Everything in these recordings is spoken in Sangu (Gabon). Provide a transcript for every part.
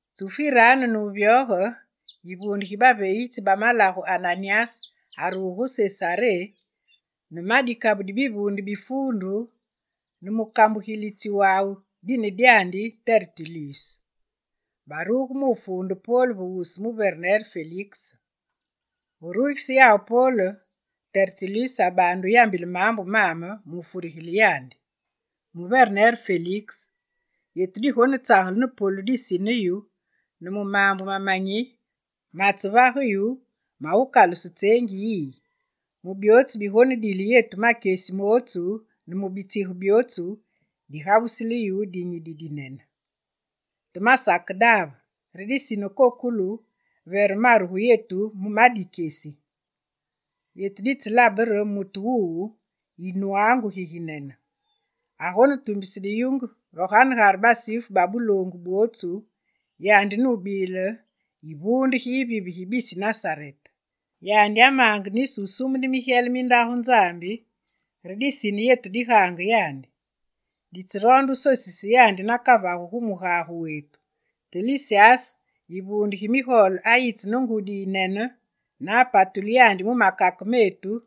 Tsufu yiraanu ne wuvyoge, yivuunde gi baveegitsi ba malagu Ananyas aruge gu Sesaré ne ma dikabu di bivuunde bi fuundu ne mukambugilitsi wawu dine dyandi Tertulus. Baruge mu wufuunde Pol ve wusu muverner Feliks. Ve rugise yawu Pol, Tertulus abaande wuyambile maambu maame mu wufurigile yandi: «Muyumene Feliks, yetu digonetsagele ne polu disine yu ne mu maambu mamanyi matsevage yu mawukaluse tseengi yiyi. Mu byootsu bigonedile yetu makyesi mootsu ne mu bitsige byootsu, digabusile yu dinyi didinene. Te masakedaave, re disine kokolu vere maru gu yetu mu ma dikyesi. Yetu ditselabe re mutu wuwu yinwaangu giginene. Agonetumbise diyunge ve ganegare Basifu ba buloongu bwotsu, yandi nubile yivuunde gi yivive gi bisi Nasarete. Yandi amaange nisi wusumune migyele mi Ndagu Nzambi re disine yetu digaange yandi. [Ditseroonde wusosise yandi nakavagu gu mugage wetu, te Lisyas yivuunde gi migole ayitse ne ngudi yiyinene ne apatule yandi mu makake meetu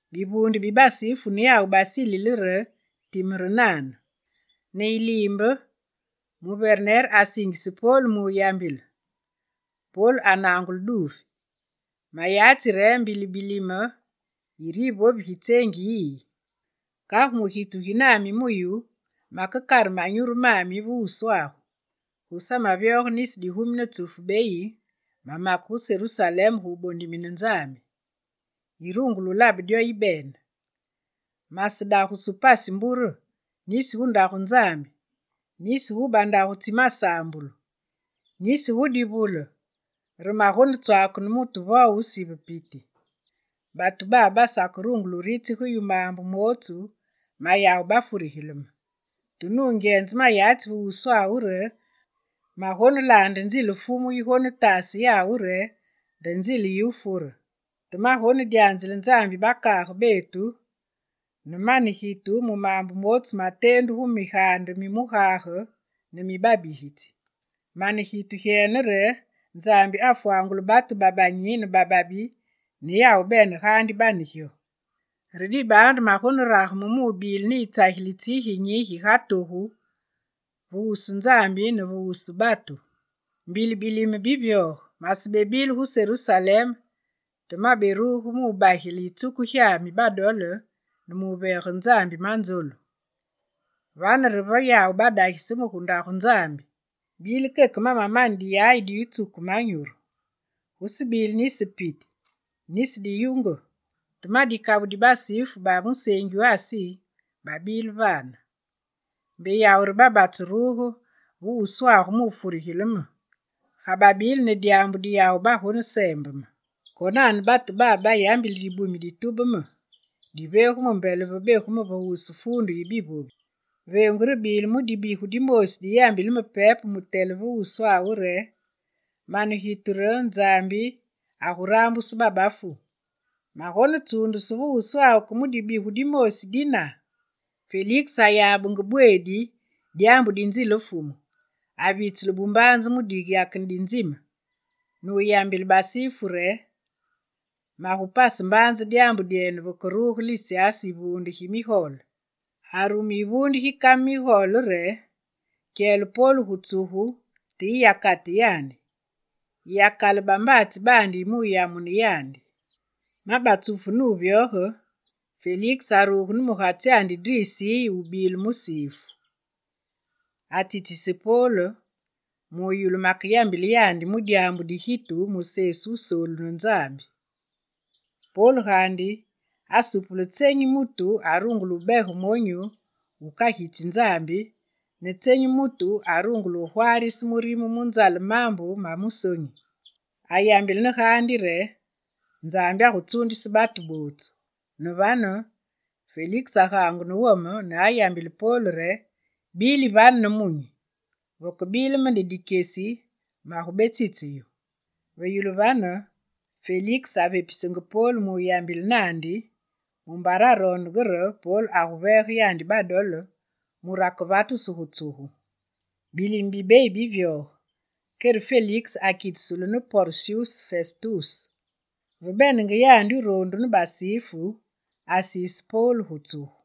Bivuunde bi Basifu ne yawu basilile re time re nane. Ne yiliimbe, muverener asingise Pol mu wuyambile. Pol anangule duufi: Mayatsi re mbili bilime yire yivovi gi tseengi yiyi. Kagu mu gitu gi nami mu yu, makekare manyuru mami ve wuswagu. Gusamevyoge nisi digumi ne tsufu beyi mamake gu Serusalem gu wubondimine Nzambi; yirungule wulabe dyo yibene. Masedagusu pasi mbure nisi, gu Ndaagu Nzambi, nisi gu bandagu tsi masaambulu, nisi gu divule re magonetswaake ne mutu vo wusive piti. Batu babe basakerungule wuritsige yu maambu mootsu mayawu bafurigile me. Te nungyenze mayatsi ve wuswagu re magonelaande nzile Fumu yigonetase yawu re nde nzile yiwufure. Te magonedyanzile Nzambi yi bakaage betu ne mane gitu mu maambu mootsu mateendu gu migaande mi mugage ne mi babigitsi. Mane gitu gyene re Nzambi agufwangule batu babanyi ne bababi ne yawu bene gaandi bane gyo. Re dibaandu magonerageme mubile ne yitsagilitsi giginyi giga togu ve wusu Nzambi ne ve wusu batu. Mbili bilime bivyoge masebile gu Serusalem te maberuge mu wubagile yitsuku gyami badole ne muveege Nzambi manzolu. Vane re ve yawu badagise me gu Ndagu Nzambi. Bile keke mamamane diyayi di wutsuke manyuru. Gusebile nisi piti, nisi diyunge. Te ma dikabu di Basifu ba museengi wu Asi babile vane. Mbe yawu re babatseruge ve wuswagu mu wufurigile me, ga babile ne dyaambu di yawu bagoneseembe me. Konane batu babe bayambili dibumi ditube me, divegu me mbele ve begu me va wusu Fuundu yi bivovi. Veengu rebile mu dibigu dimoosi di yambile me pepe mutele va wuswawu re: “Mane gitu re Nzambi agurambuse babafu. Magonetsuundusu va wusuwenu ke mu dibigu dimoosi dina?”» Feliks ayabenge bweedi dyaambu di nzile Fumu, avitsule bumbaanze mu diyakene di nzime ne wuyambile Basifu re: «Magupase mbaanze dyaambu dyenu vekeruge Lisyas yivuunde gi migole.» Arume yivuunde gi kame migole re: «Kyele Pol gu tsugu te yiyakate yandi. Yiyakale bambaatsi baandi mu wuyamune yandi.» Ma batsufu ne wuvyoge, Feliks aruge ne mugatsyandi Drisiye wubile Musifu. Atsitsise Pol, mu wuyulu makeyambile yandi mu dyaambu di gitu mu Sesu Wusoolu ne Nzambi. Pol gaandi asupule tsenyi mutu arungule wubege monyu wukagitsi Nzambi, ne tsenyi mutu arungule wugwaarise murime mu nzale maambu ma musonyi. Ayambile ne gaandi re Nzambi agutsuundise batu bootsu. Ne vane, Feliks agaangu ne wome ne ayambile Pol re: «Bili vane nemunyi! Vekebile me ne dikyesi, magubetsitse yu.» Ve yulu vane, Feliks avepisenge Pol mu wuyambile naandi, mumbare aroondenge re Pol aguveege yandi badole mure akevatusu gu tsugu. Bilime bibeyi bivyoge, kere Feliks akitusulu ne Porsyus Festus. Ve benenge yandi wuroondu ne Basifu, asiise Pol gu tsugu.